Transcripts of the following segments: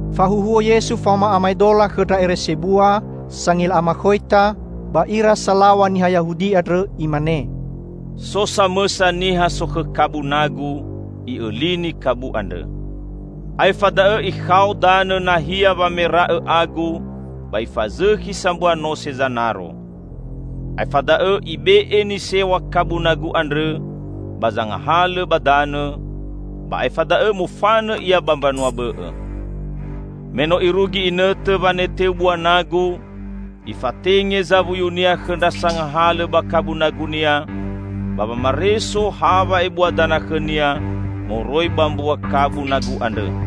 Fahuhuo Yesu faoma amaedola khõ ndra ere sebua, sangila amakhoita, ba ira salaw̃a niha Yahudi andrõ. Imane, "So samõsa niha sokhõ kabu nagu, i'õlini kabu andrõ. Aefa da'õ ikhao danõ nahia wamera'õ agu ba ifazõkhi sambua nose zanaro. Aefa da'õ ibe'e nisew̃a kabu nagu andrõ ba zangahalõ ba danõ, ba aefa da'õ mofanõ ia ba mbanua bõ'õ. Me no irugi inõtõ waneteu bua nagu, ifatenge zawuyunia khõ ndra sangahalõ ba kabu nagunia ba wamareso ha wa'ebua dana khõnia moroi ba mbua kabu nagu andrõ.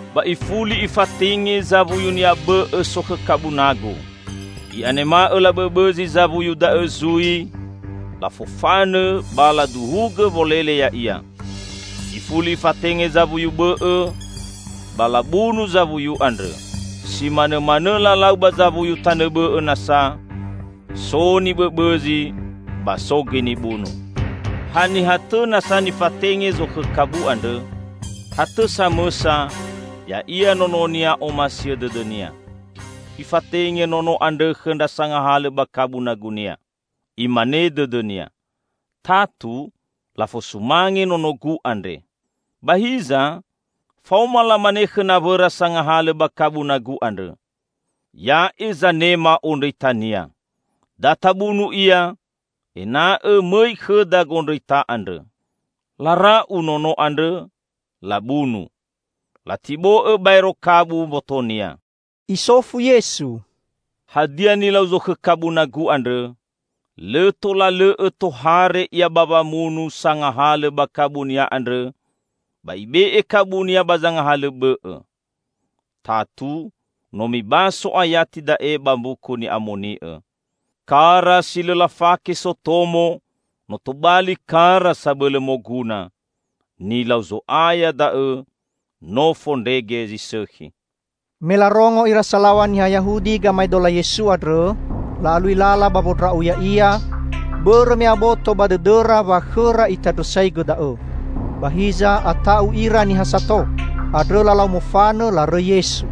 Ba ifuli ifatenge zawuyunia bõ'õ sokhõ kabu nagu. I'anema'õ labõbõzi zawuyu da'õ zui, lafofanõ ba laduhugõ wolele ya'ia. Ifuli ifatenge zawuyu bõ'õ, ba labunu zawuyu andrõ. Simanõmanõ lalau ba zawuyu tanõ bõ'õ nasa: so nibõbõzi ba so gõi nibunu. Haniha tõ nasa nifatenge zokhõ kabu andrõ? Ha tõ samõsa, ya'ia nononia omasiõ dõdõnia. Ifatenge nono andrõ khõ ndra sangahalõ ba kabu nagunia. Imane dõdõnia, 'Tatu lafosumange nonogu andre.' Ba hiza, faoma lamane khõ nawõra sangahalõ ba kabu nagu andrõ, 'Ya'e zanema ondrõitania. Da tabunu ia, ena'õ mõi khõda gondrõita andrõ!' Lara'u nono andrõ, labunu. Latibo'õ baero kabu mbotonia." Isofu Yesu, "Hadia nilau zokhõ kabu nagu andrõ? Lõ tola lõ'õ tohare ia ba wamunu sangahalõ ba kabunia andrõ, ba ibe'e kabunia ba zangahalõ bõ'õ. Tatu no mibaso ayati da'e ba Mbuku Ni'amoni'õ, 'Kara si lõ lafake sotomo no tobali kara sabõlõ moguna. Nilau Zo'aya da'õ; no fondrege zi sõkhi!'" Me larongo ira salaw̃a niha Yahudi gamaedola Yesu andrõ, la'alui lala ba wondra'u Ya'ia, bõrõ me aboto ba dõdõra wa khõra Itandrõsaigõ da'õ. Ba hiza, ata'u ira niha sato. Andrõ lalau mofanõ, larõi Yesu.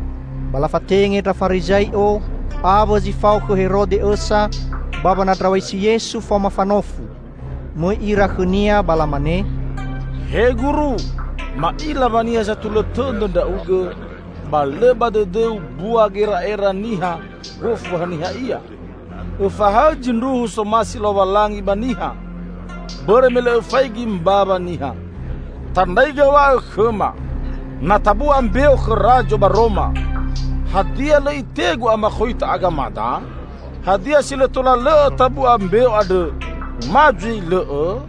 Ba lafatenge ndra Farizai'o awõ zi fao khõ Herode õsa ba wanandraw̃aisi Yesu faoma fanofu. Mõi ira khõ-Nia ba lamane, "He Guru, ma'ila wa niha satulõ tõdõ Ndra'ugõ ba lõ ba dõdõ-U mbua gera'era niha gofu haniha ia. Õfahaõ zindruhu somasi Lowalangi ba niha, bõrõ me lõ Õfaigi mbawa niha. Tandraigõ w̃a'õ khõma, 'Na tabu'a mbeo khõ Razo ba Roma, hadia lõ itegu amakhoita agamada? Hadia si lõ tola lõ'õ tabu'a mbeo andrõ, ma zui lõ'õ?'"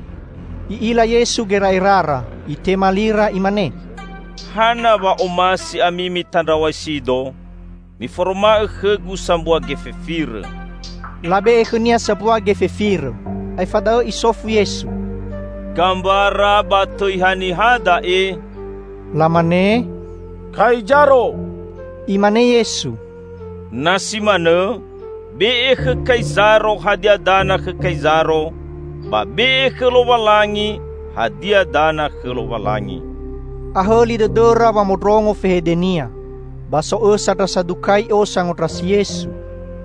I'ila Yesu gera'erara. Itema lira Imane, "Hana wa omasi ami mitandraw̃aisi-Do? Miforoma'õ khõ-Gu sambua gefe firõ." Labe'e khõ-Nia sambua gefe firõ. Aefa da'õ Isofu Yesu, "Gambara ba tõi haniha da'e?" Lamane, "Kaizaro!" Imane Yesu, "Na si manõ, be'e khõ Kaizaro hadia dana khõ Kaizaro, ba be'e khõ Lowalangi hadia dana khõ Lowalangi." Ahõli dõdõra wamondrongo fehede-Nia. Ba so õsa ndra Sadukai'o sangondrasi Yesu.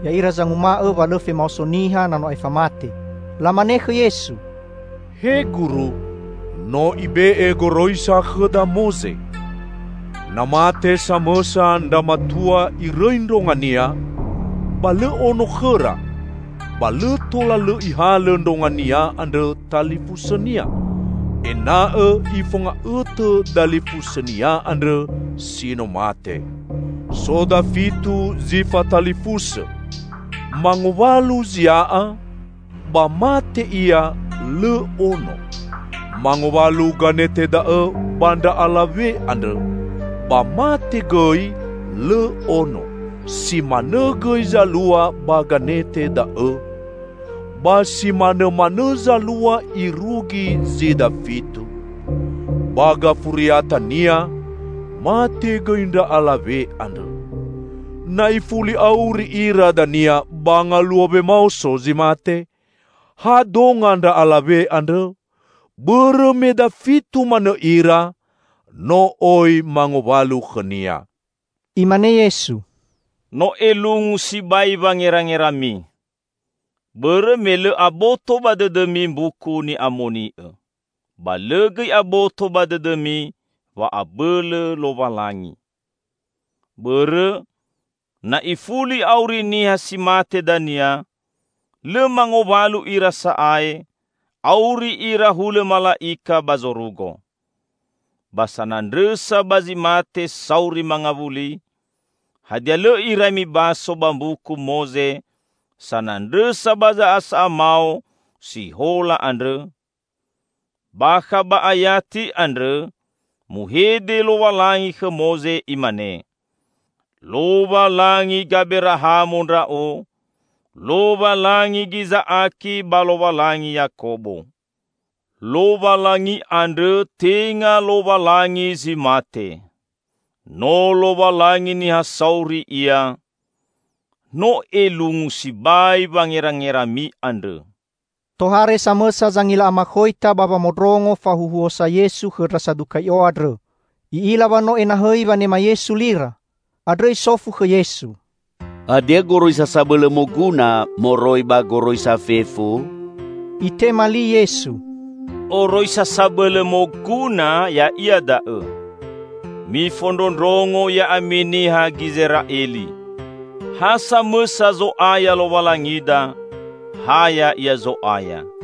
(Ya'ira zanguma'õ wa lõ femaoso niha na no aefa mate.) Lamane khõ Yesu, "He Guru, no ibe'e goroisa khõda Moze: 'Na mate samõsa ndra matua irõi ndrongania, ba lõ ono khõra, ba lõ tola lõ ihalõ ndrongania andrõ talifusõnia; ena'õ ifonga'õtõ dalifusõnia andrõ si no mate.' So dafitu zi fatalifusõ. Mangowalu zia'a, ba mate ia lõ ono. Mangowalu ganete da'õ ba ndra'alawe andrõ, ba mate gõi lõ ono. Si manõ gõi zalua ba ganete da'õ, ba simanõmanõ zalua irugi zi dafitu. Ba gafuriatania mate gõi ndra alawe andrõ. Na ifuli auri ira dania ba ngaluo wemaoso zi mate, ha donga ndra'alawe andrõ? Bõrõ me dafitu manõ ira no oi mangowalu khõnia!" Imane Yesu, "No elungu sibai wangerangerami. Bõrõ me lõ aboto ba dõdõmi Mbuku Ni'amoni'õ: ba lõ gõi aboto ba dõdõmi wa'abõlõ Lowalangi. Bõrõ, na ifuli auri niha si mate dania, lõ mangowalu ira sa'ae, auri ira hulõ mala'ika ba zorugo. Ba sanandrõsa ba zi mate sauri mangawuli, hadia lõ irai mibaso ba Mbuku Moze sanandrõsa ba za'asa'a mao si hola andrõ? Bakha ba ayati andrõ muhede Lowalangi khõ Moze Imane, 'Lowalangi Gaberahamo Ndra'o, Lowalangi Giza'aki ba Lowalangi Yakobo.' Lowalangi andrõ tenga Lowalangi zi mate. No Lowalangi niha sauri Ia. No elungu sibai wangerangerami andrõ!" Tohare samõsa zangila amakhoita ba wamondrongo fahuhuosa Yesu khõ ndra Sadukai'o andrõ. I'ila wa no enahõi wanema Yesu lira. Andrõ isofu khõ Yesu, "Hadia goroisa sabõlõ moguna moroi ba goroisa fefu?" Itema li Yesu, "Oroisa sabõlõ moguna, ya'ia da'õ: 'Mifondrondrongo ya'ami niha Gizera'eli! Ha samõsa Zo'aya Lowalangida, ha Ya'ia Zo'aya.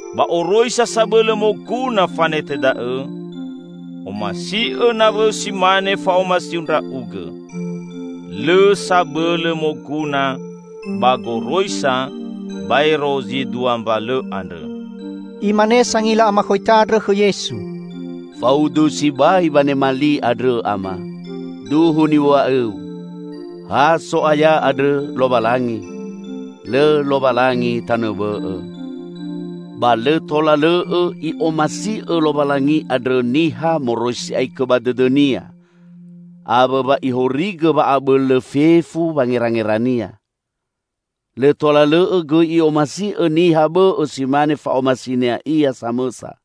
Ba oroisa sabõlõ moguna fanete da'õ: 'Omasi'õ nawõu, si mane fa'omasiu ndra'ugõ.' Lõ sabõlõ moguna ba goroisa baero zi dua mbalõ andrõ." Imane sangila amakhoita andrõ khõ Yesu, "Faudu sibai wanema li andrõ, Ama! Duhu niw̃a'õ-U: Ha So'aya andrõ Lowalangi. Lõ Lowalangi tanõ bõ'õ. Ba lõ tola lõ'õ i'omasi'õ Lowalangi andrõ niha moroi si'aikõ ba dõdõnia, awõ wa ihorigõ wa'abõlõ fefu wangerangerania. Lõ tola lõ'õ gõi i'omasi'õ niha bõ'õ si mane fa'omasinia ia samõsa.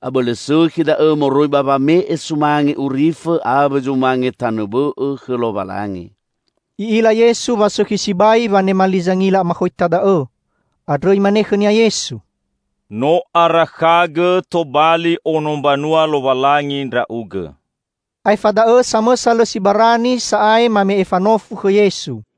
Abõlõ sõkhi da'õ moroi ba wame'e sumange urifõ awõ zumange tanõ bõ'õ khõ Lowalangi." I'ila Yesu wa sõkhi sibai wanema li zangila amakhoita da'õ. Andrõ Imane khõnia Yesu, "No arakhagõ tobali ono mbanua Lowalangi ndra'ugõ." Aefa da'õ samõsa lõ si barani sa'ae mame'e fanofu khõ Yesu.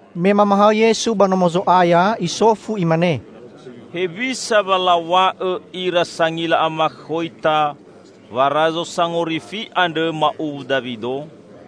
Me mamahaõ Yesu ba Nomo Zo'aya, Isofu Imane, "Hewisa wa law̃a'õ ira sangila amakhoita wa Razo Sangorifi andrõ ma'uwu Dawido?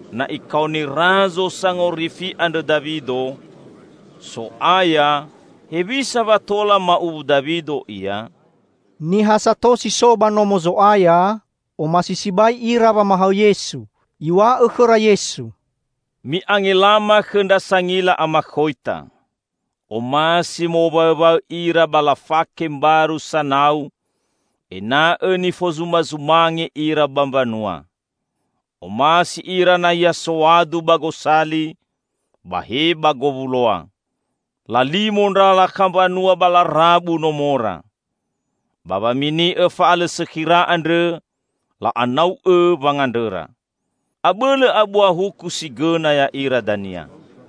Na ikaoni Razo Sangorifi andrõ Dawido, 'So'aya', hewisa wa tola ma'uwu Dawido Ia?" Niha sato si so ba Nomo Zo'aya, omasi sibai ira wamahaõ Yesu. Iw̃a'õ khõra Yesu, "Mi'angelama khõ ndra sangila amakhoita. Omasi mowaõwaõ ira ba lafake mbaru sanau ena'õ nifozumazumange ira ba mbanua. Omasi ira nahia soadu ba gosali ba he ba gowuloa. Lalimo ndra lakha mbanua ba larabu nomora. Ba wamini'õ fa'alõsõkhira andrõ, la'anau'õ wangandrõra. Abõlõ abua huku si gõna ya'ira dania!"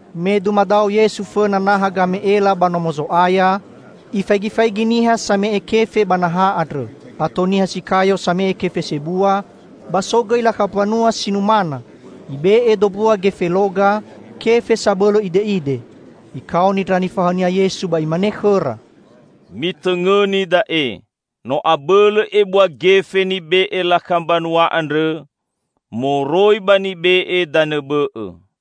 Me dumadao Yesu fõna naha game'ela ba Nomo Zo'aya, Ifaigifaigi niha samae'e kefe ba naha andrõ. Ato niha si kayo same'e kefe sebua; ba so gõi lakha mbanua si numana. Ibe'e dombua gefe loga, kefe sabõlõ ide'ide. Ikaoni ndra nifahaõ-Nia Yesu ba Imane khõra, "Mitõngõni da'e: no abõlõ ebua gefe nibe'e lakha mbanua andrõ moroi ba nibe'e danõ bõ'õ.